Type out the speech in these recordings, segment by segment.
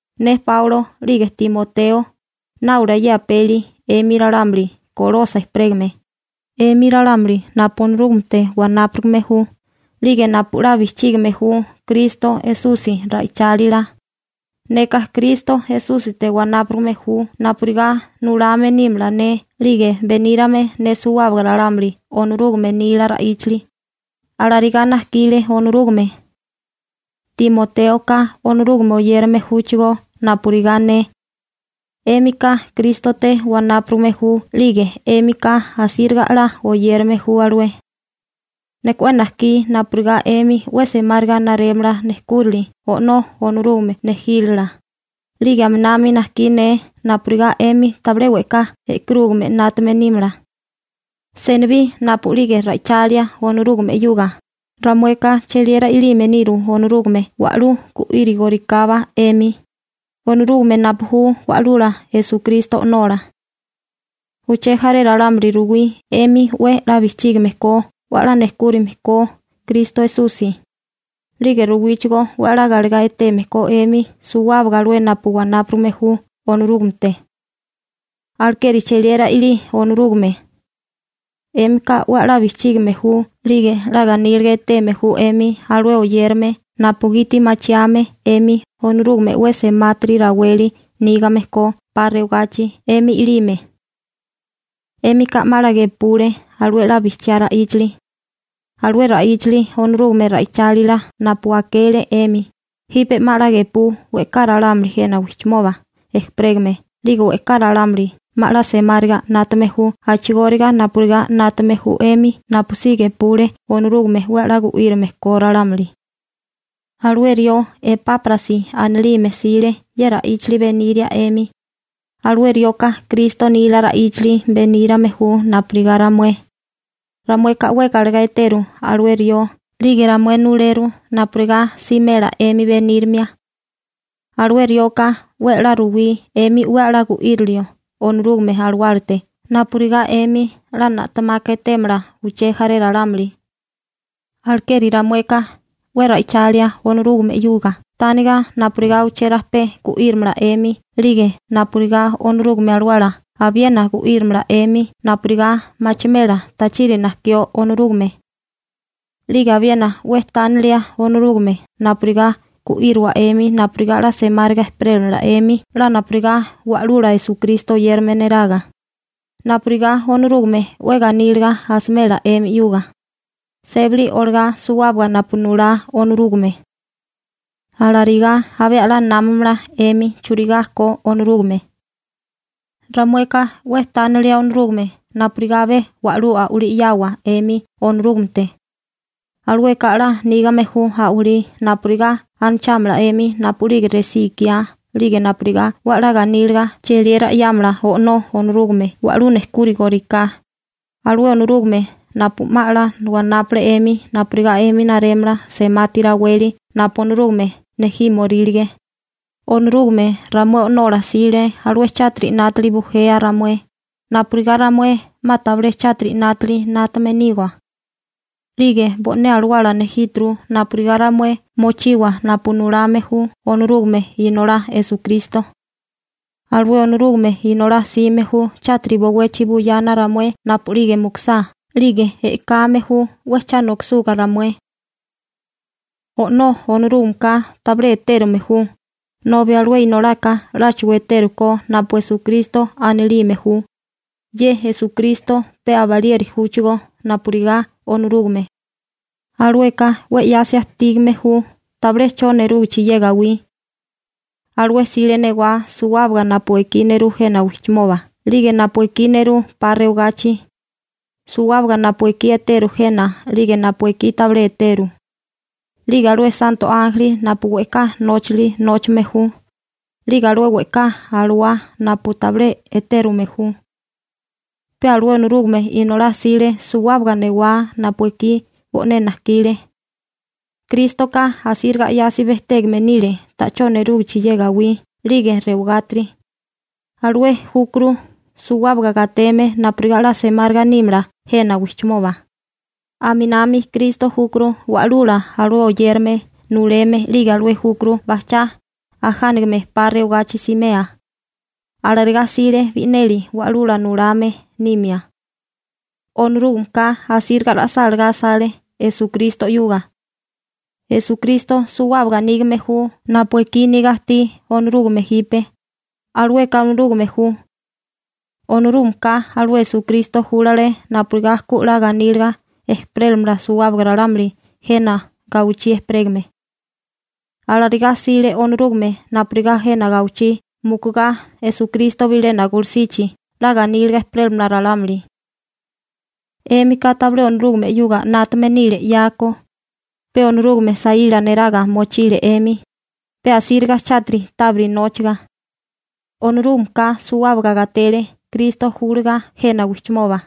Ne Páulo 'lige Timoteo náulia ye apeli 'emi ralámuli Kolosa ejperégame, 'emi ralámuli napu Onorúgamete wanápurigame ju, 'lige napu 'la bijchígime ju Kristo Esusi ra'ichálila. Neka Kristo Esúsite wanápurigame ju napurigá nulame nímala ne 'lige benírame ne suwábaga ralámuli Onorúgame nila ra'íchali. Alarigá najkile Onorúgame. Timotéoka Onorúgame oyérame júchigó napurigá ne. 'Émika Krístote wanápurigame ju, 'lige 'émika asíriga a'lá oyérame ju alué. Neka 'we najkí napurigá 'emi 'we semáriga narémala nejkúrali O'nó Onorúgame nejílala, 'lige aminami najkí ne napurigá 'emi tabilé we'ká e'karúgame 'nátame nímala. Senibí napu'lige ra'ichalia Onorúgame 'yuga, ramueka cheliera i'lime niru Onorúgame wa'lú gu'írigorikábá 'emi, Onorúgame napu ju Wa'lula Esukristo O'nola. Uché jaré ralámuli ruwí 'emi 'we 'la bijchígame ko 'we 'la nejkúrime ko Kristo Esusi, 'lige ruwíchigó 'we 'la galegá eteme ko 'emi suwábaga alué napu wanápurigame ju Onorúgamete. Alekeri cheliera i'lí Onorúgame. 'Émika 'we 'la bijchígame ju 'lige 'la ganíliga eteme ju 'emi alué oyérame napugiti machiame 'emi Onorúgame 'we semátiri raweli nígame ko 'pa rewagachi 'emi i'lime. 'Émika 'ma 'la gepule alué 'la bijchiá ra'íchali. Alué ra'íchali Onorúgame ra'ichálila napu akele 'emi, jipe 'ma 'la gepú we'ká ralámuli jena wijchimoba ejperégame, 'lige we'ká ralámuli 'ma 'la semáriga 'nátame ju a'chigóriga napurigá 'nátame ju 'emi napusí gepule Onorúgame 'we 'la gu'írame ko ralámuli. Alué rió Epáprasi anilime 'sile ye ra'íchali beniria 'emi. Alué rioka Kristo nila ra'íchali benírame ju napurigá ramué. Ramueka 'we galegá eteru alué rió, 'lige ramué nuleru napurigá simela 'emi benírimia. Alué rioka 'we 'la ruwí 'emi 'we 'la gu'írilio Onorúgame Alawálate napurigá 'emi 'la na'temaka etémala uché jaré ralámuli. Alekeri ramueka 'we ra'ichalia Onorúgame 'yuga tániga napurigá uché rajpé gu'írimala 'emi 'lige napurigá Onorúgame Alawala abiena gu'írimala 'emi napurigá machimela tachiri najkió Onorúgame. 'Lige abiena 'we tánilia Onorúgame napurigá gu'íriwa 'emi napurigá 'la semáriga ejperélamala 'emi 'la napurigá Wa'lula Esukristo oyérame neraga, napurigá Onorúgame 'we ganíliga asimela 'emi 'yuga, sébali olagá suwábaga napu nulá Onorúgame. Alarigá abé 'la námamala 'emi churigá ko Onorúgame. Ramueka 'we tánilia Onorúgame napurigá abé wa'lú a'walí 'yawa 'emi Onorúgamete. Alueka 'la nígame ju a'walí napurigá 'la anachámala 'emi napu'lige resí ikiá 'lige napurigá 'we 'la ganíliga cheliera 'yámala O'nó Onorúgame wa'lú nejkúrigoriká, alué Onorúgame napu 'ma 'la wanápale 'emi napurigá 'emi narémala semati raweli napu Onorúgame nejímorílige. Onorúgame ramué O'nola 'sile alué chátiri 'nátili bujea ramué, napurigá ramué 'ma tabilé chátiri 'nátili 'nátame niwa. 'Lige bo'né alawala nejíturu napurigá ramué mochiwa napu nulame ju Onorúgame Inolá Esukristo. Alué Onorúgame Inolá 'sime ju chátiri bowechi buyana ramué napu'lige mukusá, 'lige e'kame ju 'we cha nokisuga ramué. O'nó Onorúgameka tabilé etérume ju, nobi alué Inolaka 'láchigo etérukó napu Esukristo anilime ju. Ye Esukristo pe abalieri júchigó napurigá Onorúgame. Alueka 'we 'yasi ajtígame ju tabilé 'cho nerúgichi ye gawí. Alué 'sile newá suwábaga napu ekí nerú jena wijchimoba 'lige napu ekí nerú 'pa rewagachi, suwábaga napu ekí eteru jena 'lige napu ekí tabilé eteru, 'lige alué santo ánjeli napu we'ká nóchali nóchame ju, 'lige alué we'ká alawá napu tabilé etérume ju. Pe alué Onorúgame Inolá 'sile suwábaga newá napu ekí bo'né najkile. Krístoka asíriga 'yasi bejtégame nile ta'chó nerúgichi ye gawí 'lige rewagátiri, alué júkuru suwábaga gateme napurigá 'la semáriga nímala jena wijchimoba. Aminami Kristo júkuru Wa'lula alué oyérame nuleme 'lige alué júkuru bajchá ajánigame 'pa rewagachi simea. Alarigá 'sile bi'neli wa'lula nulame nimia. Onorúgameka asíriga ra'sálagá asale Esukristo 'yuga. Esukristo suwábaga nígame ju napu ekí niga ajtí Onorúgame jipe, alueka Onorúgame ju. Onorúgameka alué Esukristo júlale napurigá ku 'la ganíliga ejperélamala suwábaga ralámuli jena gawichí ejperégame. Alarigá 'sile Onorúgame napurigá jena gawichí mukugá Esukristo bilena gulusichi 'la ganíliga ejperélamala ralámuli. 'Émika tabilé Onorúgame 'yuga 'nátame nile 'yako, pe Onorúgame saíla neraga mochile 'emi, pe asíriga chátiri tábiri nóchaga. Onorúgameka suwábaga gatele Kristo júliga jena wijchimoba,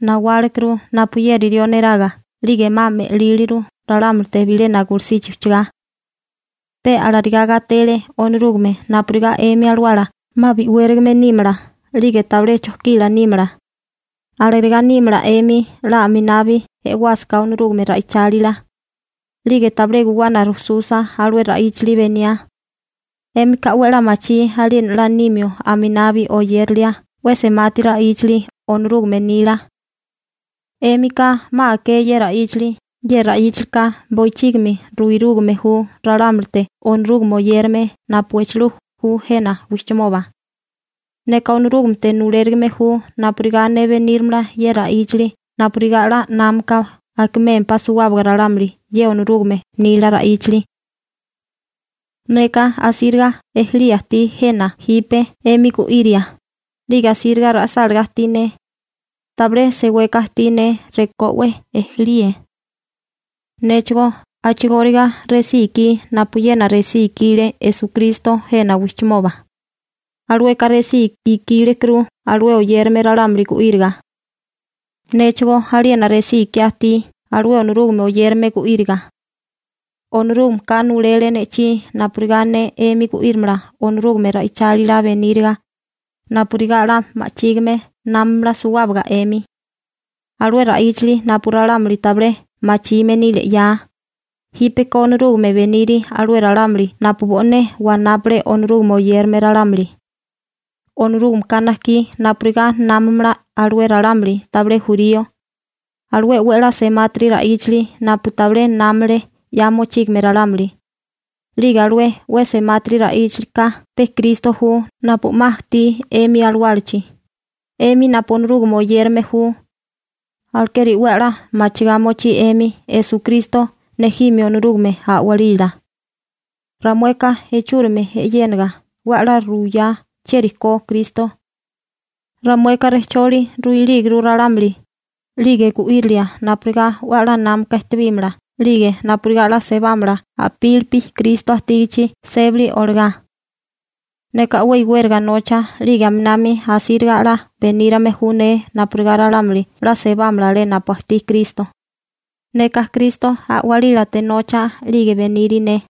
nawálekuru napuyeri rió neraga 'lige 'ma me'líliru ralámulite bilena gulusichi ujchagá. Pe alarigá gatele Onorúgame napurigá 'emi alawala 'ma bi'wérigame nímala 'lige tabilé chojkila nímala. Alarigá nímala 'emi 'la aminabi e'wásaká Onorúgame ra'ichálila, 'lige tabilé guwana rujsusa alué ra'íchali beniá. 'Émika 'we 'la machí aliena 'la nimio aminabi oyérilia 'we semati ra'íchali Onorúgame nila. 'Émika 'ma aké ye ra'íchali. Ye ra'íchalika bochígimi ruirúgame ju ralámulite Onorúgame oyérame napu echilú ju jena wijchimoba. Neka Onorúgamete nulérigime ju napurigá ne benírimala ye ra'íchali napurigá 'la námaka akimémpá suwábaga ralámuli ye Onorúgame nila ra'íchali. Neka asíriga ejelía ajtí jena jipe 'emi gu'iria, 'lige asíriga ra'sálagá ajtí ne. Tabilé seweka ajtí ne rekó 'we ejelíe. Néchigó a'chigóriga resí ikí napuyena resí ikile Esukristo jena wijchimoba. Alueka resí ikílekuru alué oyérame ralámuli gu'íriga. Néchigó aliena resí ikiá ajtí alué Onorúgame oyérame gu'íriga. Onorúgameka nulele ne'chí napurigá ne 'emi gu'írimala Onorúgame ra'ichálila beníriga, napurigá 'la ma'chígime námamala suwábaga 'emi. Alué ra'íchali napu ralámuli tabilé machime nile 'ya, jípeko Onorúgame beniri alué ralámuli napu bo'né wanápale Onorúgame oyérame ralámuli. Onorúgameka najkí napurigá námamala alué ralámuli tabilé jurío, alué 'we a'lá semátiri ra'íchali napu tabilé námale 'ya mochígame ralámuli, 'lige alué 'we semátiri ra'íchalika pe Kristo ju napu 'ma ajtí 'emi alawálachi, 'emi napu Onorúgame oyérame ju. Alekeri 'we a'lá machigá mochí 'emi Esukristo nejimio Onorúgame a'walila. Ramueka ichúrimi e'yéniga 'we 'la ruyá chieri ko Kristo. Ramueka rejcholi ruilíguru ralámuli, 'lige gu'írilia napurigá 'we a'lá námaka ejtebímala, 'lige napurigá 'la sebámala a'pílipi Kristo ajtígichi sébali olagá. Neka 'we iwériga nocha 'lige aminami asíriga a'lá benírame ju ne napurigá ralámuli 'la sebámala alé napu ajtí Kristo. Neka Kristo a'walílate nocha 'lige beniri ne.